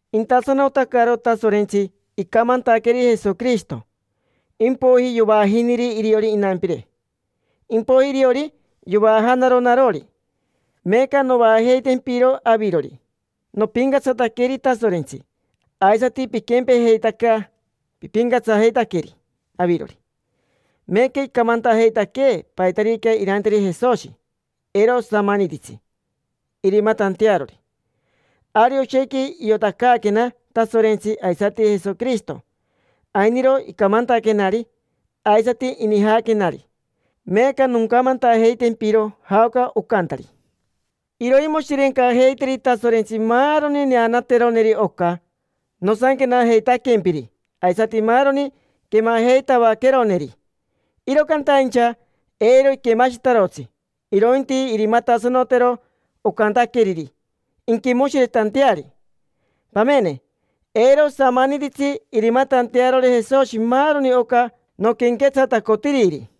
Intasanotacaro Tasorentsi, icamantaqueri Jesoquirishito, impoiji yovaajiniri iriori inampire, impoiji iriori yovaajanaro narori, meeca novaajeitempiro avirori. Nopincatsataqueri Tasorentsi, aisati piquempejeitaca, pipincatsajeitaqueri avirori; meeca icamantajeitaquee paitarica iranteri Jesoshi: eiro osamanititsi irimatantearori. Ari oshequi iotacaaquena Tasorentsi aisati Jesoquirishito: ainiro icamantaquenari aisati inijaquenari. Meeca noncamantajeitempiro jaoca ocantari. Iroimoshirencajeiteri Tasorentsi maaroni neanateroneri oca nosanquenajeitaquempiri aisati maaroni quemajeitavaqueroneri. Iro cantaincha eiro iquemashitarotsi, irointi irimatasanotero ocantaqueriri inquimoshiretanteari. Pamene, eiro osamanititsi irimatantearori Jesoshi maaroni oca noquenquetsatacotiriri.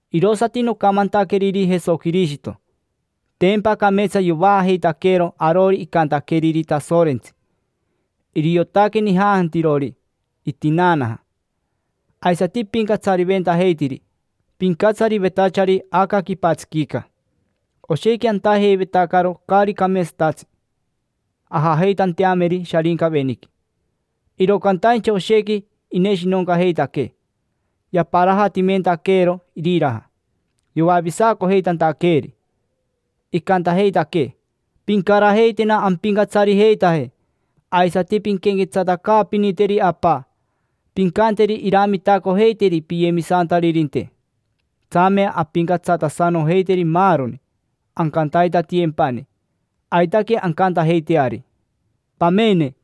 Irosati nocamantaqueriri Jesoquirishito: tempa cameetsa yovaajeitaqueero arori icantaqueriri Tasorentsi. Iriotaque nijantajirori itinaanaja, aisati ipincatsariventajeitiri pincatsarivetachari aca quipatsiquica. Oshequi antajeivetacaro caari cameetsatatsi ajajeitanteameri Sharincaveniqui, iro cantaincha oshequi ineshinoncajeitaquee, yaparajatimentaqueero iriraja, yoavisacojeitantaqueeri. Icantajeitaquee: “Pincarajeitena ampincatsarijeitaje, aisati pinquenquetsatacaapiniteri Apa: pincanteri iramitacojeiteri piyemisantaririnte”. Tsame ampincatsatasanojeiteri maaroni, ancantaitatiyempani. Aitaque ancantajeiteari. Pamene,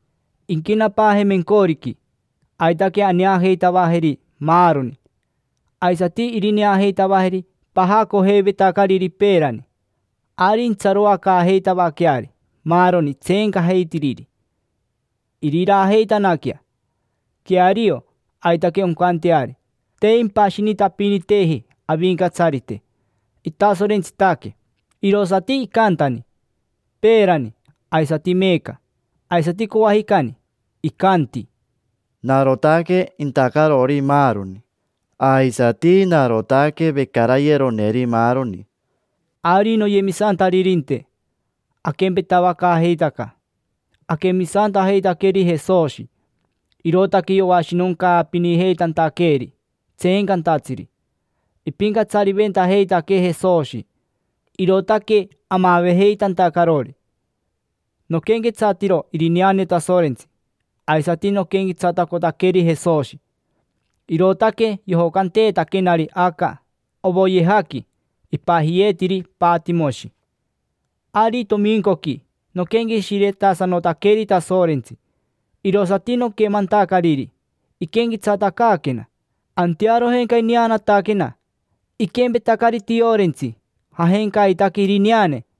inquenapaaje mencoriqui, aitaque aneajeitavajeri maaroni. Aisati irineajeitavajeri pajacojeivetacariri peerani. Ari intsaroacaajeitavaqueari maaroni tseencajeitiriri, iriraajeitanaquea, jii, jii. Queario, aitaque oncanteari. Te impashinitapiniteji Avincatsarite, itasorentsitaque, irosati icantani: peerani, aisati meeca, aisati coajicani. Icanti: “Narotaque intacarori maaroni, aisati narotaque vecarayeroneri maaroni”. Ari, noyemisantaririnte, aquempetavacaajeitaca: aquemisantajeitaqueri Jesoshi, irootaque yoashinoncaapinijeitantaqueeri tseencantatsiri. Ipincatsariventajeitaquee Jesoshi, irootaque amavejeitantacarori. Noquenquetsatiro irineane Tasorentsi aisati noquenquetsatacotaqueri Jesoshi, irootaque yojocanteetaquenari aca ovoyejaqui ipajiyeetiri Patimoshi. Ari tomincoqui noquenqueshiretasanotaqueri Tasorentsi, irosati noquemantacariri iquenquetsatacaaquena. Antearojenca ineanataquena, iquempetacari tiorentsi; jajencaitaque irineane,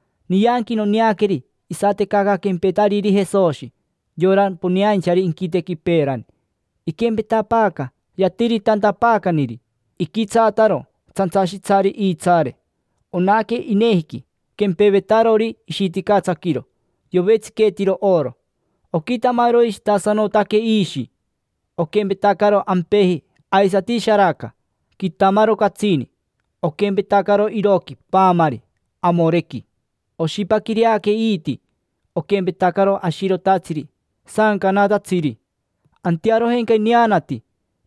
Nianqui noneaqueri isatecaca quempetariri Jesoshi, yora poneainchari inquitequi peerani, iquempetapaaca yatiritantapaacaniri. Iquitsaataro tsantsashitsari iitsaare, onaque inejiqui quempevetarori ishiticatsaquiro, yovetsiqueetiro oro. Oquitamaroishitasanotaque iishi, oquempetacaro ampeji aisati sharaca: quitamaro catsini. Oquempetacaro iroqui paamari amorequi. Oshipaquireaque iiti, oquempetacaro ashirotatsiri saancanatatsiri. Antearojenca ineanati,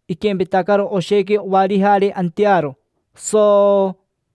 iquempetacaro oshequi ovarijare antearo, sooo.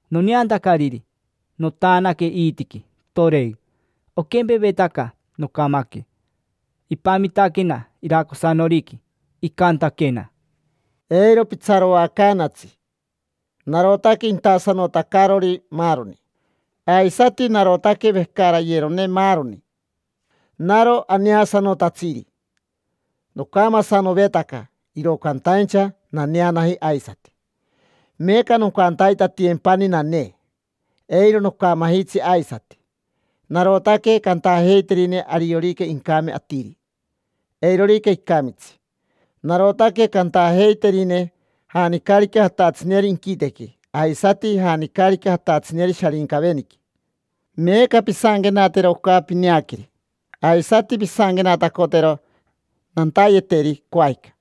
Noneantacariri, notaanaque iitiqui, toren. Oquempevetaca nocamaque. Ipamitaquena iracosanoriqui, icantaquena: —Eiro pitsaroacaanatsi, narotaque intasanotacarori maaroni, aisati narotaque vecarayerone maaroni. Naro aneasanotatsiri. Nocamasanovetaca, iro cantaincha naneanaji aisati; meeca noncantaitatiyempani nanee. Eiro nocamajitsi aisati. Narotaque cantajeiterine ariorica incame atiri, eirorica icamitsi; narotaque cantajeiterine janicarica jatatsineri inquitequi aisati janicarica jatatsineri Sharincaveniqui. Meeca pisanquenatero oca pineaqueri, aisati pisanquenatacotero nantayeteri coajica.